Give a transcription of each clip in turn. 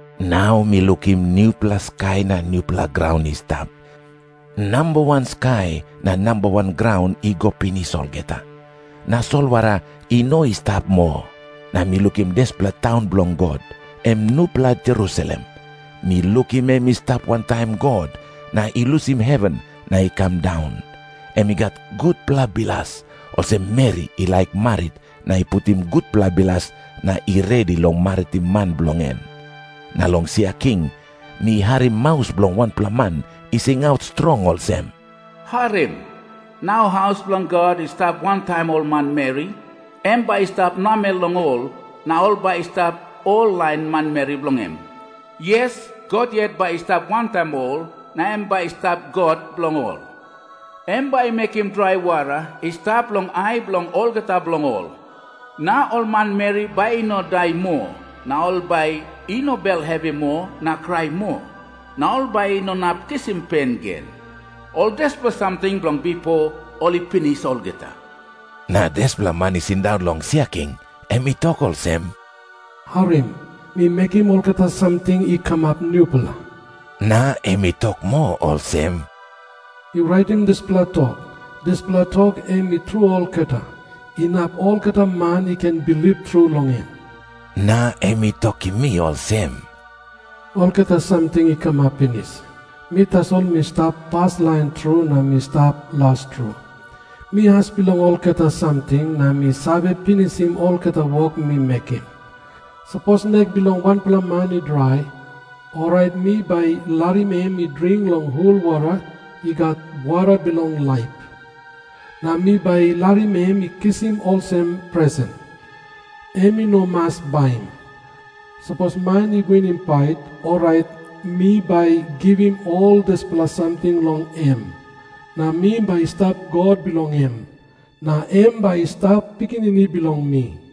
Nau mi lukim nupela skai na nupela graun i stap. Namba wan skai na namba wan graun i go pinis olgeta. Na solwara i no i stap moa. Na mi lukim dispela taun bilong God, em nupela Jerusalem. Mi lukim em i stap wantaim God, na i lusim heven na i kam daun. Em i gat gutpela bilas, olsem meri i laik marit na i putim gutpela bilas na i redi long maritim man bilong en. Na long sia king mi harim maus bilong wanpela man i singaut strong olsem, “Harim. Nau haus bilong God i stap wantaim ol manmeri. Em bai i stap namel long ol, na ol bai i stap ol lain manmeri bilong em. Yes, God yet bai i stap wantaim ol, na em bai i stap God bilong ol. Em bai i mekim drai wara i stap long ai bilong olgeta bilong ol. Na ol manmeri bai i no i dai moa, na ol bai i no bel hevi moa na krai moa, na ol bai i no inap kisim pen gen. Ol dispela samting bilong bipo ol i pinis olgeta.” Na dispela Man i sindaun long sia king, em i tok olsem, “Harim. Mi mekim olgeta samting i kamap nupela.” Na em i tok moa olsem, “Yu raitim dispela tok. Dispela tok em i tru olgeta, inap olgeta man i ken bilip tru long en.” Na em i tokim mi olsem, “Olgeta samting i kamap pinis. Mi tasol mi stap paslain tru na mi stap las tru. Mi as bilong olgeta samting, na mi save pinisim olgeta wok mi mekim. Sapos nek bilong wanpela man i drai, orait mi bai larim em i dring long hul wara i gat wara bilong laip. Na mi bai larim em i kisim olsem presen. Em i no mas baim. Sapos man i winim pait, orait mi bai givim ol dispela samting long em, na mi bai stap God bilong em, na em bai i stap pikinini bilong mi.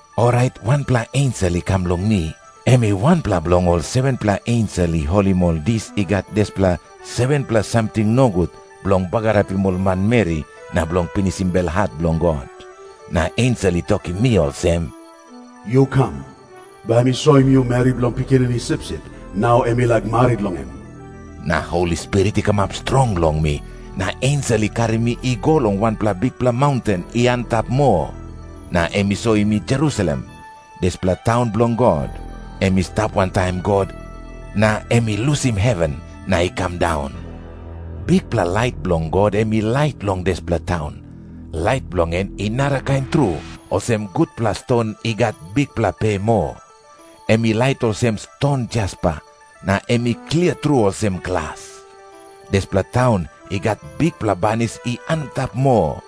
Orait wanpela ensel i kam long mi. Em i wanpela bilong ol 7-pela ensel i holim ol dis i gat dispela 7-pela samting nogut bilong bagarapim ol manmeri na bilong pinisim belhat bilong God. Na ensel i tokim mi olsem, “Yu kam. Bai mi soim yu meri bilong Pikinini Sipsip, nau em i laik marit long em.” Na Holi Spirit i kamap strong long mi, na ensel i karim mi i go long wanpela bikpela maunten i antap moa. Na em i soim mi Jerusalem, dispela taun bilong God, em i stap wantaim God, na em i lusim heven na i kam daun. Bikpela lait bilong God em i lait long dispela taun. Lait bilong en i narakain tru, olsem gutpela ston i gat bikpela pe moa. Em i lait olsem ston jaspa, na em i klia tru olsem glas. Dispela taun i gat bikpela banis i antap moa.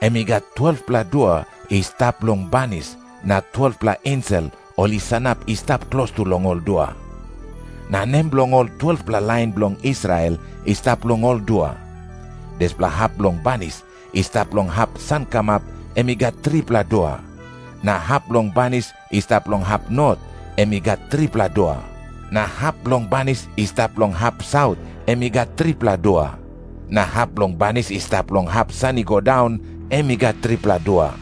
Em i gat 12-pela dua i stap long banis, na 12-pela ensel ol i sanap i stap klostu long ol dua. Na nem bilong ol 12-pela lain bilong Israel i stap long ol dua. Dispela hap bilong banis i stap long hap sankamap em i gat tripela dua. Na hap bilong banis i stap long hap not em i gat tripela dua. Na hap bilong banis i stap long hap saut em i gat tripela dua. Na hap bilong banis i stap long hap san i go daun em i gat tripela dua.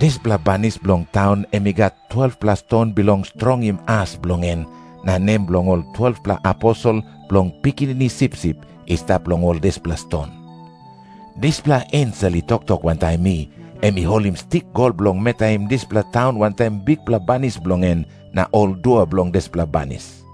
Dispela banis bilong taun em i gat 12-pela ston bilong strongim as bilong en, na nem bilong ol 12-pela aposel bilong Pikinini Sipsip i stap long ol dispela ston. Dispela ensel i toktok wantaim mi, em i holim stik gol bilong metaim dispela taun wantaim bikpela banis bilong en na ol dua bilong dispela banis.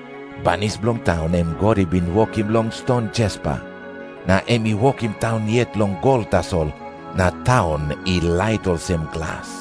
Banis bilong taun em God i bin wokim long ston jaspa. Na em i wokim taun yet long gol tasol, na taun i lait olsem glas.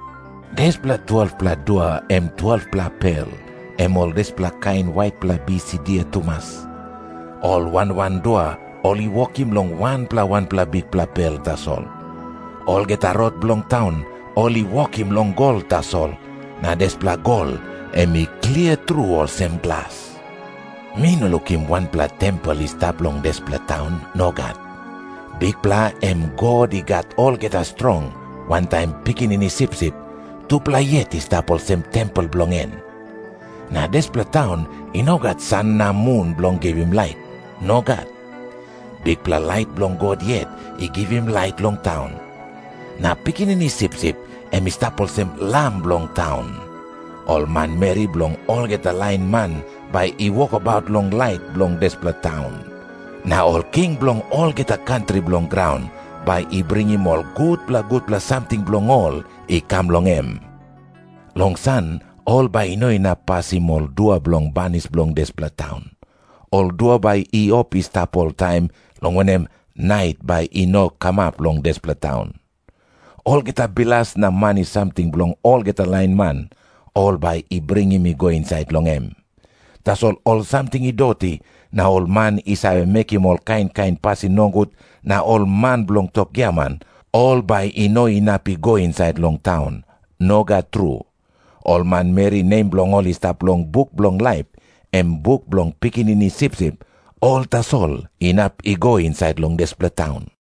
Dispela 12-pela dua em 12-pela pel, em ol dispela kain waitpela bis i dia tumas. Ol wan wan dua ol i wokim long wanpela wanpela bikpela pel tasol. Olgeta rot bilong taun ol i wokim long gol tasol, na dispela gol em i klia tru olsem glas. Mi no lukim wanpela tempel i stap long dispela taun. Nogat. Bikpela, em God I Gat Olgeta Strong, wantaim Pikinini Sipsip, tupela yet i stap olsem tempel bilong en. Na dispela taun i no gat san na mun bilong givim lait. Nogat. Bikpela lait bilong God yet i givim lait long taun. Na Pikinini Sipsip em i stap olsem lam bilong taun. Ol manmeri bilong olgeta lain man bai i wokabaut long lait bilong dispela taun. Na ol king bilong olgeta kantri bilong graun bai i bringim ol gutpela gutpela samting bilong ol i kam long em. Long san ol bai i no inap pasim ol dua bilong banis bilong dispela taun. Ol dua bai i op i stap oltaim, long wanem, nait bai i no kamap long dispela taun. Olgeta bilas na mani samting bilong olgeta lain man, ol bai i bringim i go insait long em. Tasol ol samting i doti na ol man i save mekim ol kain kain pasin nogut na ol man bilong tok giaman, ol bai i no inap i go insait long taun. Nogat tru. Ol manmeri nem bilong ol i stap long buk bilong laip, em buk bilong Pikinini Sipsip, ol tasol inap i go insait long dispela taun.